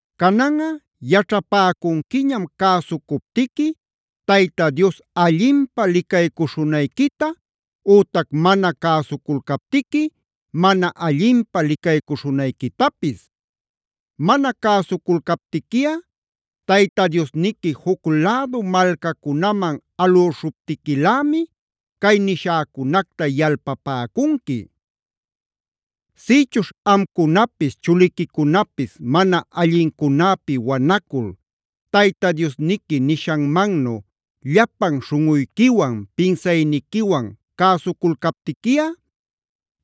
“Cananꞌa yaćhapäcunquiñam cäsucuptiqui Tayta Dios allinpä licaycuśhunayquita ütac mana cäsuculcaptiqui mana allinpä licaycuśhunayquitapis. Mana cäsuculcaptiquiꞌa Tayta Diosniqui juc lädu malcacunaman alüśhuptiquilämi cay nishäcunacta yalpapäcunqui. Sïchuśh amcunapis, chuliquicunapis mana allincunäpi wanacul Tayta Diosniqui nishanmannu llapan śhunꞌuyquiwan, pinsayniquiwan cäsuculcaptiquiꞌa,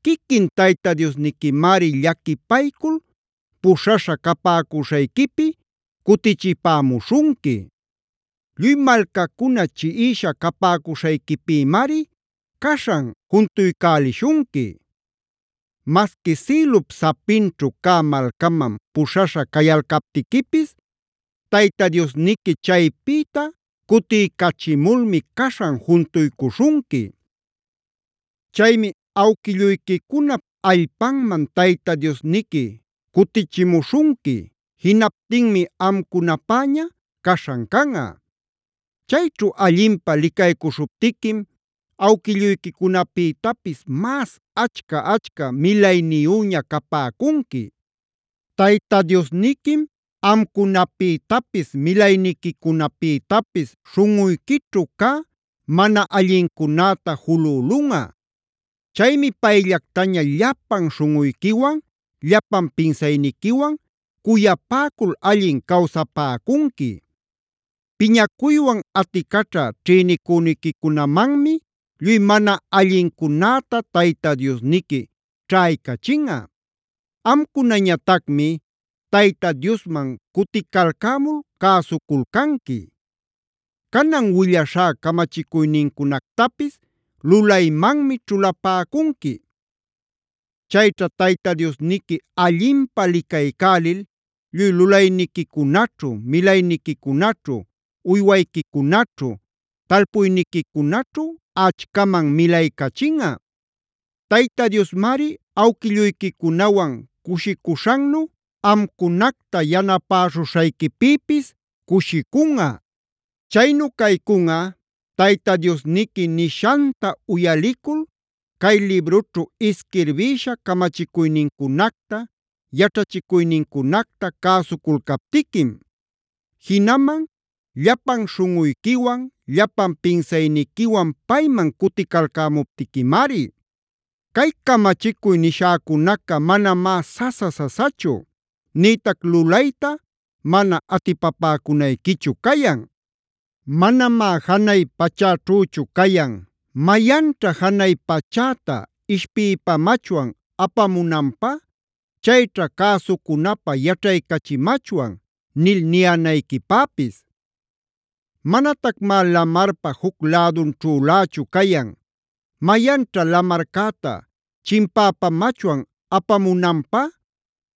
quiquin Tayta Diosniquimari llaquipaycul puśhaśha capäcuśhayquipi cutichipämuśhunqui. Lluy malcacuna chiꞌisha capäcuśhayquipïmari caśhan juntuycälishunqui. Masqui sïlup sapinćhu cä malcaman puśhaśha cayalcaptiquipis Tayta Diosniqui chaypïta cutiycachimulmi caśhan juntuycuśhunqui. Chaymi awquilluyquicunap allpanman Tayta Diosniqui cutichimuśhunqui; jinaptinmi amcunapäña caśhan canꞌa. Chayćhu allinpä licaycuśhuptiquim awquilluyquicunapïtapis mas achca-achca milayniyüña capäcunqui. “Tayta Diosniquim amcunapïtapis milayniquicunapïtapis śhunꞌuyquićhu cä mana allincunäta julülunꞌa.a Chaymi payllactaña llapan śhunꞌuyquiwan, llapan pinsayniquiwan cuyapäcul allin cawsapäcunqui. Piñacuywan aticaćha ćhïnicüniquicunamanmi lluy mana allincunäta Tayta Diosniqui ćhaycachinꞌa. Amcunañatacmi Tayta Diosman cuticalcämul cäsuculcanqui; canan willaśhá camachicuynincunactapis lulaymanmi ćhulapäcunqui. Chayćha Tayta Diosniqui allinpä licaycälil lluy lulayniquicunaćhu, milayniquicunaćhu, uywayquicunaćhu, talpuyniquicunaćhu achcaman milaycachinꞌa. Tayta Diosmari awquilluyquicunawan cushicuśhannu amcunacta yanapäśhuśhayquipïpis cushicunꞌa. Chaynu caycunꞌa Tayta Diosniqui nishanta uyalicul cay librućhu isquirbïsha camachicuynincunacta, yaćhachicuynincunacta cäsuculcaptiquim; jinaman llapan śhunꞌuyquiwan, llapan pinsayniquiwan payman cuticalcämuptiquimari. “Cay camachicuy nishäcunaca manamá sasa-sasachu, nïtac lulayta mana atipapäcunayquichu cayan. Manamá janay pachäćhüchu cayan: ‘¿Mayanćha janay pachäta ishpïpamachwan apamunanpä? Chayćha cäsucunapä yaćhaycachimachwan’ nil ninayquipäpis. Manatacmá lamarpa juc lädunćhülächu cayan: ‘¿Mayanćha lamarcäta chimpäpamachwan apamunanpä?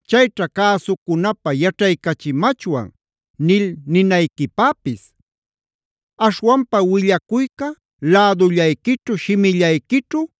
Chayćha cäsucunapä yaćhaycachimachwan’ nil ninayquipäpis. Aśhwanpa willacuyca lädullayquićhu, shimillayquićhu,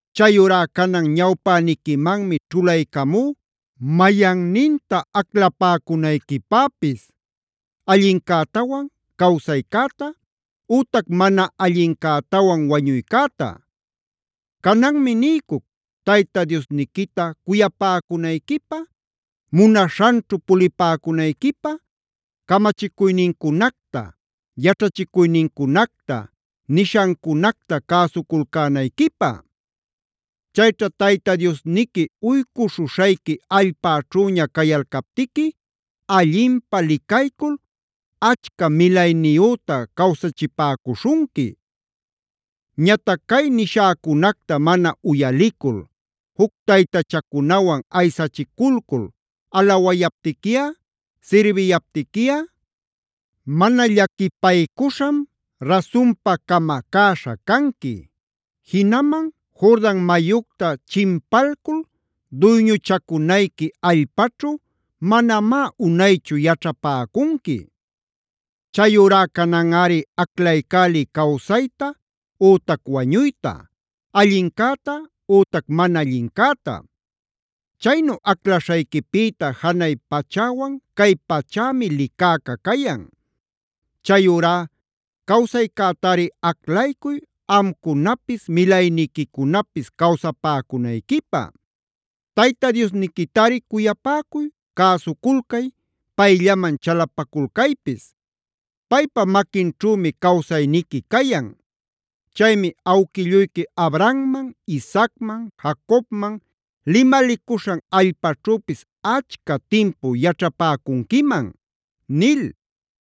“Chayurá canan ñawpäniquimanmi ćhulaycamú mayanninta aclapäcunayquipäpis: allincätawan cawsaycäta ütac mana allincätawan wañuycäta. Cananmi niycuc Tayta Diosniquita cuyapäcunayquipä, munaśhanćhu pulipäcunayquipä, camachicuynincunacta, yaćhachicuynincunacta, nishancunacta cäsuculcänayquipä. Chayćha Tayta Diosniqui uycuśhuśhayqui allpaćhüña cayalcaptiqui allinpä licaycul achca milayniyüta cawsachipäcuśhunqui. Ñatac cay nishäcunacta mana uyalicul juc taytachacunawan aysachiculcul alawayaptiquiꞌa, sirbiyaptiquiꞌa, mana llaquipaycuśham rasunpa camacäśha canqui. Jinaman Jordan mayucta chimpalcul duyñuchacunayqui allpaćhu manamá unaychu yaćhapäcunqui. Chayurá cananꞌari aclaycäliy cawsayta ütac wañuyta, allincäta ütac mana allincäta. Chaynu aclaśhayquipïta janay pachäwan cay pachämi licäca cayan. Chayurá cawsaycätari aclaycuy amcunapis milayniquicunapis cawsapäcunayquipä. Tayta Diosniquitari cuyapäcuy, cäsuculcay, payllaman chalapaculcaypis. Paypa maquinćhümi cawsayniqui cayan. Chaymi awquilluyqui Abrahamman,c Isaacman,d Jacobmane limalicuśhan allpaćhüpis achca timpu yaćhapäcunquiman” nil.